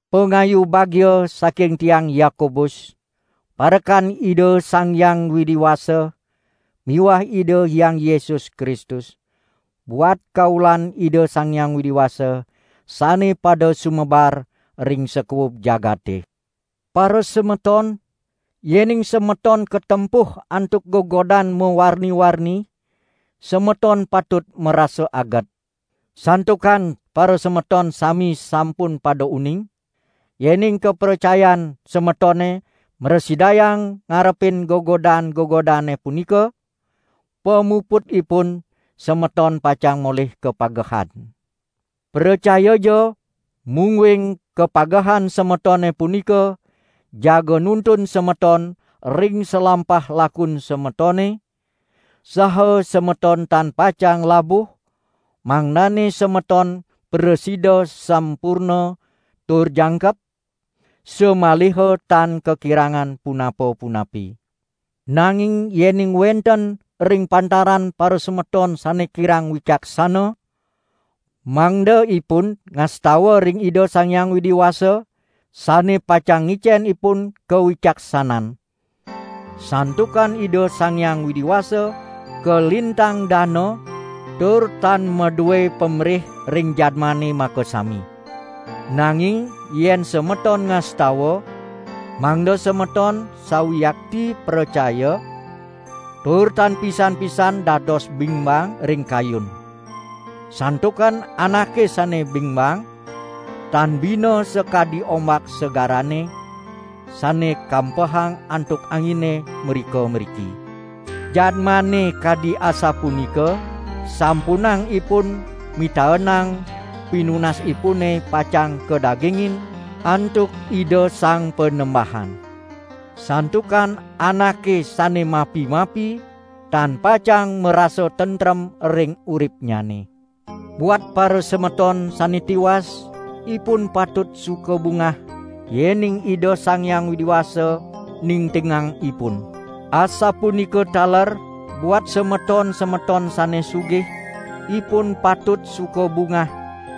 Pangayu bagia saking tiang Yakobus, parekan Ida Sang Hyang Widi Wasa miwah Ida Hyang Yesus Kristus, buat kaulan Ida Sang Hyang Widi Wasa sane pada sumebar ring sakuub jagate. Parasemeton, yening semeton katempuh antuk gegodan mawarni-warni, semeton patut marasa aget. Santukan parasemeton sami sampun pada uning, yening kapracayan semetone mrasidayang ngarepin gegodan-gegodane punika, pamuputipun semeton pacang molih kapagehan. Pracayaja mungguing kapagehan semetone punika jaga nuntun semeton ring salampah lakun semetone, saha semeton tan pacang labuh, mangdane semeton prasida sampurna tur jangkep, samaliha tan kakirangan punapa-punapi. Nanging yening wenten ring pantaran parasemeton sane kirang wicaksana, mangda ipun ngastawa ring Ida Sang Hyang Widi Wasa sane pacang ngicen ipun kawicaksanan; santukan Ida Sang Hyang Widi Wasa kalintang dana tur tan madue pamrih ring jadmane makasami. Nanging yen semeton ngastawa, mangda semeton sawiakti pracaya, tur tan pisan-pisan dados bingbang ring kayun. Santukan anake sane bingbang, tan bina sakadi ombak segarane, sane kampehang antuk angine mrika-mriki. Jadmane kadi asapunika sampunang ipun mitaenang pinunasipune pacang kadagingin antuk Ida Sang Panembahan. Santukan anake sane mapi-mapi, tan pacang marasa tentrem ring uripnyane. Buat parasemeton sane tiwas ipun patut suka bungah yening Ida Sang Hyang Widi Wasa ningtingang ipun. Asapunika taler buat semeton-semeton sane sugih, ipun patut suka bungah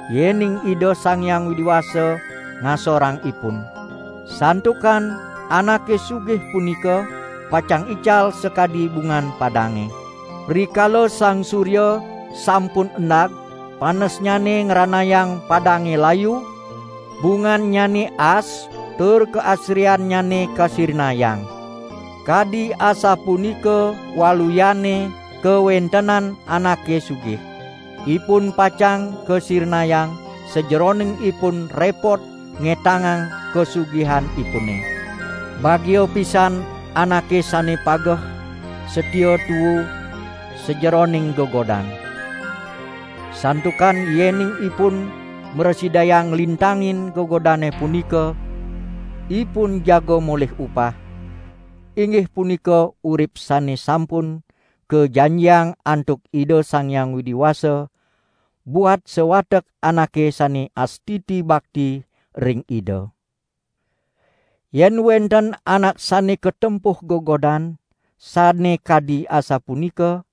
yening Ida Sang Hyang Widi Wasa ngasorang ipun. Santukan anake sugih punika pacang ical sakadi bungan padange. Rikala sang surya sampun endag panesnyane ngranayang padange layu, bungannyane aas tur kaasriannyane kasirnayang. Kadi asapunika waluyane kawentenan anake sugih. Ipun pacang kasirnayang sajeroning ipun repot ngetangang kasugihanipune. Bagia pisan anake sane pageh satia tuu sajeroning gegodan. Santukan yening ipun mrasidayang nglintangin gegodane punika, ipun jaga molih upah, inggih punika urip sane sampun kajanjiang antuk Ida Sang Hyang Widi Wasa buat sawatek anake sane astiti bakti ring Ida. Yen wenten anak sane katempuh gegodan sane kadi asapunika,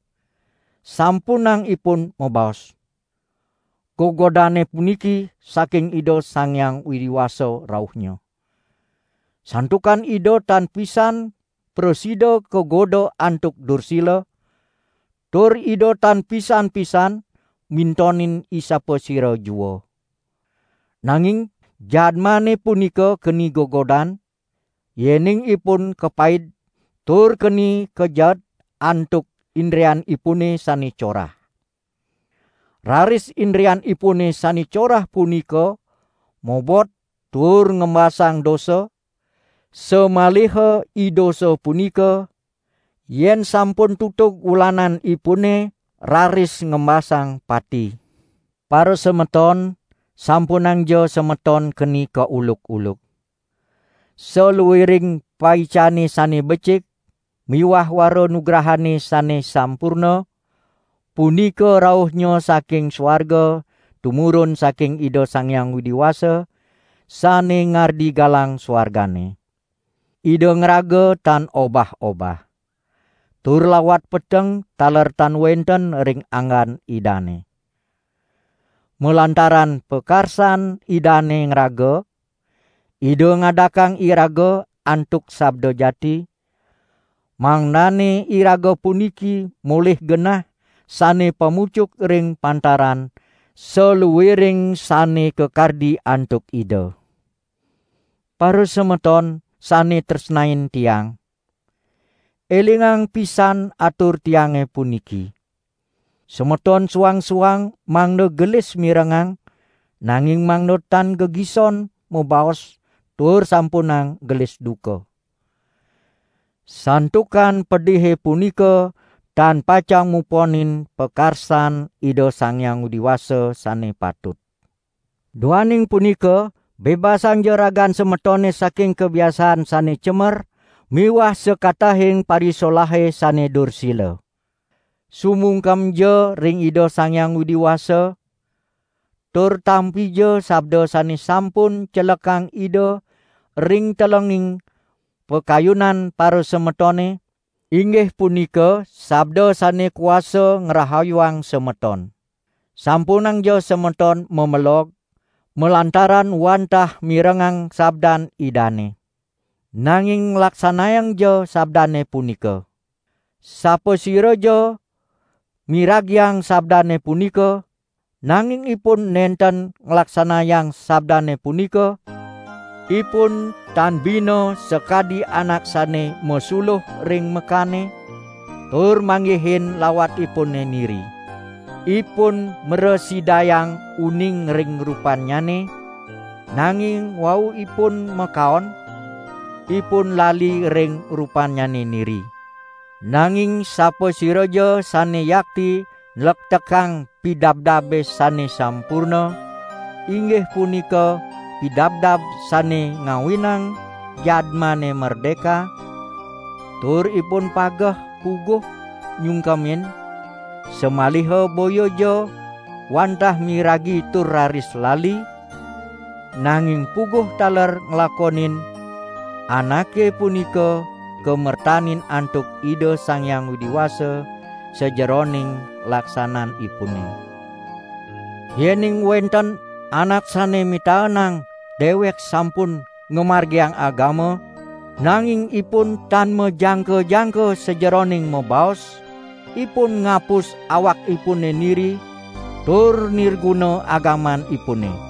sampunang ipun mabaos: "Gegodane puniki saking Ida Sang Hyang Widi Wasa rauhnya." Santukan Ida tan pisan prasida kagoda antuk dursila, tur Ida tan pisan-pisan mintonin isapasira jua. Nanging jadmane punika keni gegodan, yening ipun kapaid tur keni kajeet antuk indrianipune sane corah. Raris indrianipune sane corah punika mobot tur ngembasang dosa, samaliha idosa punika, yen sampun tutug wulananipune raris ngembasang pati. Parasemeton, sampunangja semeton keni kauluk-uluk! Saluiring paicane sane becik miwah wara nugrahane sane sampurna, punika rauhnya saking suarga tumurun saking Ida Sang Hyang Widi Wasa sane ngardi galang suargane. Ida ngraga tan obah-obah; tur lawat peteng taler tan wenten ring anggan Idane. Malantaran pakarsan Idane ngraga Ida ngadakang iraga antuk sabda jati, mangdane iraga puniki molih genah sane pamucuk ring pantaran saluiring sane kakardi antuk Ida. Parasemeton sane tresnain tiang, elingang pisan atur tiange puniki: Semeton suang-suang mangda gelis mirengang, nanging mangda tan gegison mabaos tur sampunang gelis duka. Santukan pedihe punika tan pacang muponin pakarsan Ida Sang Hyang Widi Wasa sane patut. Duaning punika bebasangja ragan semetone saking kabiasaan sane cemer miwah sakatahing parisolahe sane dursila. Sumungkemja ring Ida Sang Hyang Widi Wasa, tur tampija sabda sane sampun celekang Ida ring telenging pakayunan parasemetone, inggih punika sabda sane kuasa ngrahayuang semeton. Sampunangja semeton mamelog, malantaran wantah mirengang sabdan Idane. Nanging laksanayangja sabdane punika. Sapasiraja miragiang sabdane punika, nanging ipun nenten nglaksanayang sabdane punika, ipun tan bina sakadi anak sane masuluh ring mekane tur manggihin lawatipune niri. Ipun mrasidayang uning ring rupannyane, nanging wau ipun makaon, ipun lali ring rupannyane niri. Nanging sapasiraja sane yakti nlektekang pidabdabe sane sampurna, inggih punika pidabdab sane ngawinang jadmane merdeka, tur ipun pageh puguh nyungkemin, samaliha boyaja wantah miragi tur raris lali, nanging puguh taler nglakonin, anake punika kamertanin antuk Ida Sang Hyang Widi Wasa sajeroning laksananipune. Yening wenten anak sane mitaenang dewek sampun ngamargiang agama, nanging ipun tan majangka-jangka sajeroning mabaos, ipun ngapus awakipune niri tur nirguna agamanipune.